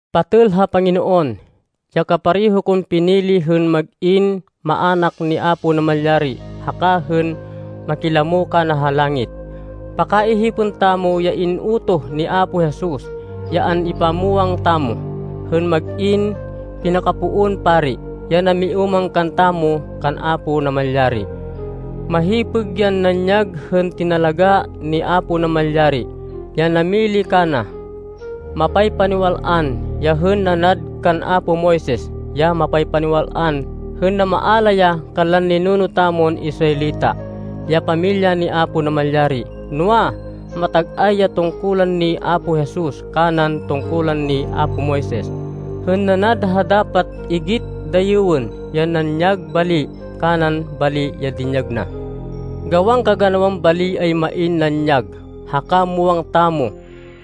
Patêl ha Panginoon, ya kapareho kon pinili hên mag-in maának ni Apo Namalyari haka hên makilamo kana ha langit, pakaihipên tamo ya in-utoh hi Apo Jesus, ya an-ipamwang tamo, hên mag-in pinakapoon pari ya namiúmang kantamo kan Apo Namalyari. Mahipêg yan nanyag hên tinalagá ni Apo Namalyari, ya namili kana. Mapaypaniwal-an ya hên nanad kan apo Moises ya mapaypaniwal-an hên namaala ya kanlan ninuno tamon Israelita, ya pamilya ni Apo Namalyari. Noa, matag-ay ya tungkulan ni Apo Jesus, kanan tungkulan ni apo Moises, hên nanad ha dapat igit dayêwên ya nanyag bali kanan bali ya dinyag na. Gawan kaganawan bali ay main nanyag, haka muwang tamo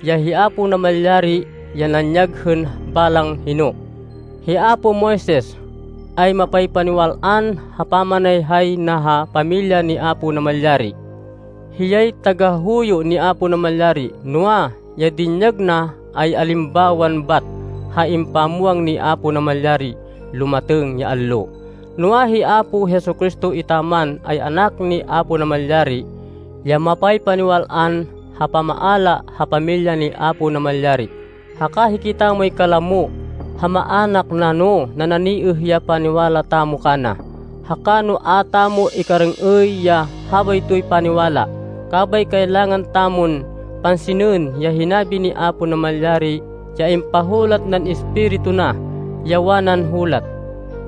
ya hi Apo Namalyari ya nanyag hên balang hino. Hi apo Moises, ay mapaypaniwal-an ha pamanayhay na ha pamilya ni Apo Namalyari, hiyay tagahuyo ni Apo Namalyari, noa, ya dinyag na ay alimbawan bat ha ipamwang ni Apo Namalyari lumatêng ya allo. Noa, hi Apo Jesu-Cristo etaman, ay Anak ni Apo Namalyari, ya mapaypaniwal-an ha pamamaala ha pamilya ni Apo Namalyari. Haka hikitamoy kalamo ha maának na no nananiêh ya paniwala tamo kana, haka no a tamo ikarêng-êy ya habaytoy paniwala. Kabay kailangan tamon pansinên ya hinabi ni Apo Namalyari ya impahulat nan Espiritu na, ya wanan hulat,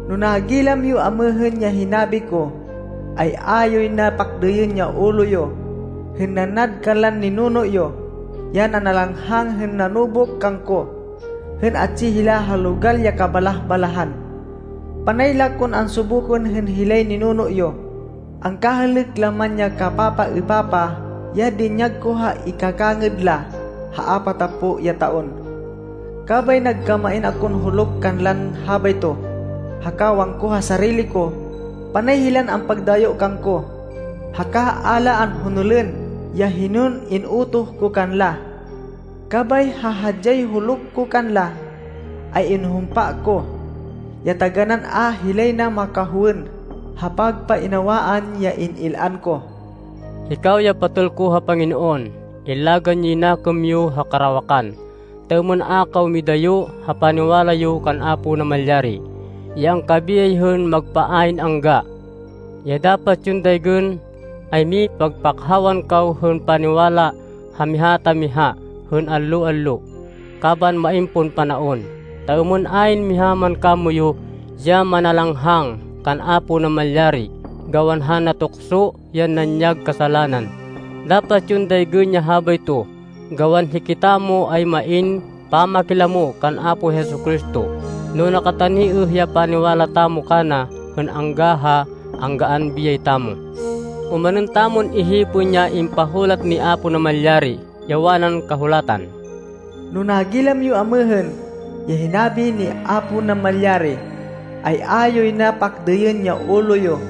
“No nagilam yo amêhên ya hinabi ko, ay a yoy na pakdêyên ya ulo yo, hên nanad kanlan ninuno yo, ya nanalanghang hên nanubuk kangko hên atsi hila ha logal ya kabalah-balahan. Panay la kon ansubukan hên hilay ninuno yo, angkahêlêk la man ya kapapaêpapah ya dinyag ko ha ikakangêd la ha apatapo ya taon. Kabay nagkamain akon huluk kanlan habayto, haka wangko ha sarili ko, ‘panay hilan ampagdayo kangko, haka a la anhonolên ya hinon in-utoh ko kanla.’ Kabay ha hadyay huluk ko kanla, ay inhumpa ko, ya taganán a hilay na makahowên ha pagpainawaan ya in-il-an ko.” Hikaw ya patêl ko ha Panginoon, illagan yoy nakêm yo ha karawakan, ta êmên a kaw midayo ha paniwala yo kan Apo Namalyari, ya angkabiyay hên magpa ayn angga. Ya dapat yon daygên, ay mipagpakhawan kaw hên paniwala ha miha ta miha hên allo-allo kaban main pon panaon, ta êmên ayn miha man kamoyu ya manalanghang kan Apo Namalyari gawan ha natukso yan nanyag kasalanan. Dapat yon daygên ya habayto, gawan hikitamo ay main pamakilamo kan Apo Jesu-Cristo, no nakataniêh ya paniwala tamo kana hên angga ha anggaan biyay tamo. Omanên tamon ihipên ya impahulat ni Apo Namalyari, ya wanan Kahulatan, “No nagilam yo amêhên ya hinabi ni Apo Namalyari, ay a yoy na pakdêyên ya ulo yo,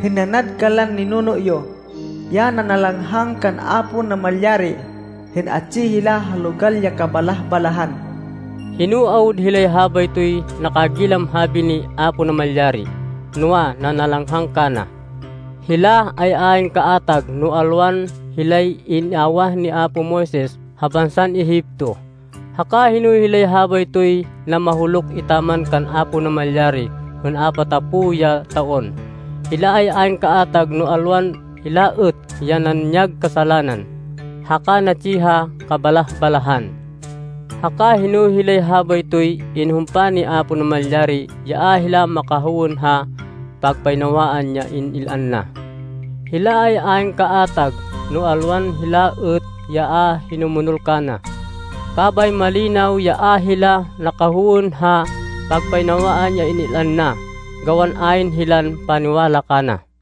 hên nanad kanlan ninuno yo, ya nanalanghang kan Apo Namalyari hên atsi hila ha logal ya kabalah-balahan.” Hino awud hilay habaytoy nakagilam habi ni Apo Namalyari, noa, nanalanghang kana? Hila ay ayn kaatag no alwan hilay in-awah ni apo Moises ha bansan Egipto! Haka hino hilay habaytoy namahuluk etaman kan Apo Namalyari hên apatapo ya taon? Hila ay ayn kaatag no alwan hila êt ya nanyag kasalanan, haka natsi ha kabalah-balahan! Haka hino hilay habaytoy inhumpa ni Apo Namalyari ya a hila makahowên ha pagpainawaan ya in-il-an na? Hila ay ayn kaatag no alwan hila êt ya a hinumonol kana! Kabay malinaw ya a hila nakahowên ha pagpainawaan ya in-il-an na, gawan ayn hilan paniwala kana.